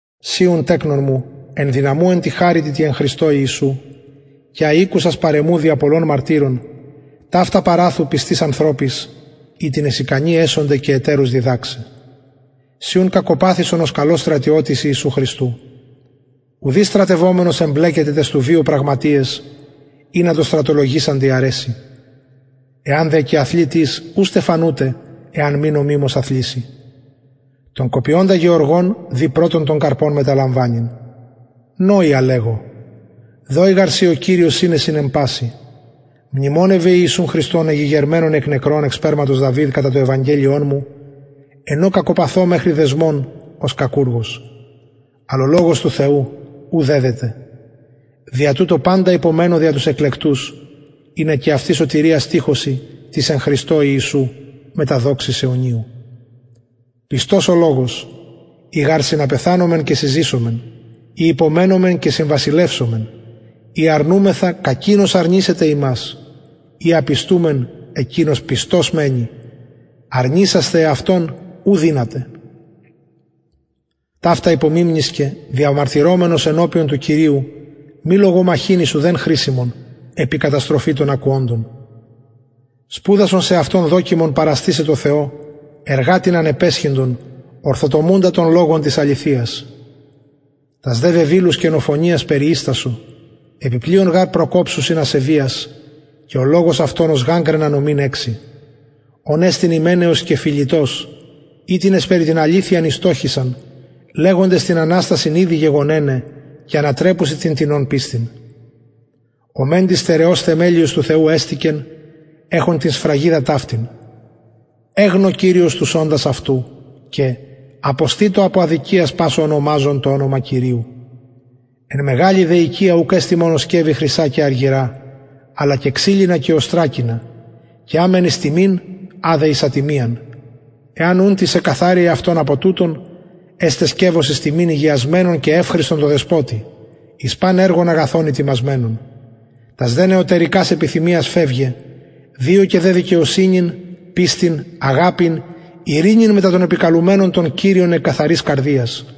συ ουν τεκνον μου ενδυναμου εν τη χαριτι τη εν χριστω ιησου και α ηκουσας παρ εμου δια πολλων μαρτυρων ταυτα παραθου πιστοις ανθρωποις οιτινες ικανοι εσονται και ετερους διδαξαι συ ουν κακοπαθησον ως καλος στρατιωτης ιησου χριστου ουδεις στρατευομενος εμπλεκεται ταις του βιου πραγματειαις ινα τω στρατολογησαντι αρεση εαν δε και αθλη τις ου στεφανουται εαν μη νομιμως αθληση τον κοπιωντα γεωργον δει πρωτον των καρπων μεταλαμβανειν νοει α λεγω δωη γαρ σοι ο κυριος συνεσιν εν πασιν μνημονευε ιησουν χριστον εγηγερμενον εκ νεκρων εκ σπερματος δαυιδ κατα το ευαγγελιον μου εν ω κακοπαθω μεχρι δεσμων ως κακουργος αλλ ο λογος του θεου ου δεδεται δια τουτο παντα υπομενω δια τους εκλεκτους ινα και αυτοι σωτηριας τυχωσιν της εν χριστω ιησου μετα δοξης αιωνιου πιστος ο λογος ει γαρ συναπεθανομεν και συζησομεν ει υπομενομεν και συμβασιλευσομεν ει αρνουμεθα κακεινος αρνησεται ημας ει απιστουμεν εκεινος πιστος μενει αρνησασθαι εαυτον ου δυναται ταυτα υπομιμνησκε διαμαρτυρομενος ενωπιον του κυριου μη λογομαχειν εις ουδεν χρησιμον επι καταστροφη των ακουοντων σπουδασον σεαυτον δοκιμον παραστησαι τω θεω εργατην ανεπαισχυντον ορθοτομουντα τον λογον της αληθειας τας δε βεβηλους κενοφωνιας περιιστασο επι πλειον γαρ προκοψουσιν ασεβειας και ο λογος αυτων ως γαγγραινα νομην εξει ων εστιν υμεναιος και φιλητος οιτινες περι την αληθειαν ηστοχησαν λεγοντες την αναστασιν ηδη γεγονεναι και ανατρεπουσιν την τινων πιστιν ο μεντοι στερεος θεμελιος του θεου εστηκεν εχων την σφραγιδα ταυτην εγνω κυριος τους οντας αυτου και αποστητω απο αδικιας πας ο ονομαζων το ονομα κυριου εν μεγαλη δε οικια ουκ εστιν μονον σκευη χρυσα και αργυρα αλλα και ξυλινα και οστρακινα και α μεν εις τιμην α δε εις ατιμιαν εαν ουν τις εκκαθαρη εαυτον απο τουτων εσται σκευος εις τιμην ηγιασμενον και ευχρηστον τω δεσποτη εις παν εργον αγαθον ητοιμασμενον τας δε νεωτερικας επιθυμιας φευγε διωκε δε δικαιοσυνην πιστιν αγαπην ειρηνην μετα των επικαλουμενων τον κυριον εκ καθαρας καρδιας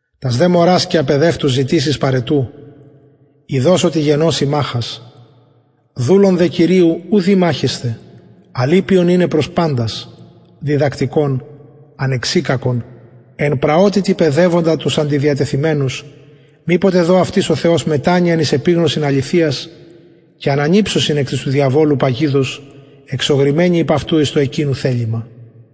τας δε μωρας και απαιδευτους ζητησεις παραιτου ειδως οτι γεννωσιν μαχας δουλον δε κυριου ου δει μαχεσθαι αλλ ηπιον ειναι προς παντας διδακτικον ανεξικακον εν πραοτητι παιδευοντα τους αντιδιατιθεμενους μηποτε δω αυτοις ο θεος μετανοιαν εις επιγνωσιν αληθειας και ανανηψωσιν εκ της του διαβολου παγιδος εζωγρημενοι υπ αυτου εις το εκεινου θελημα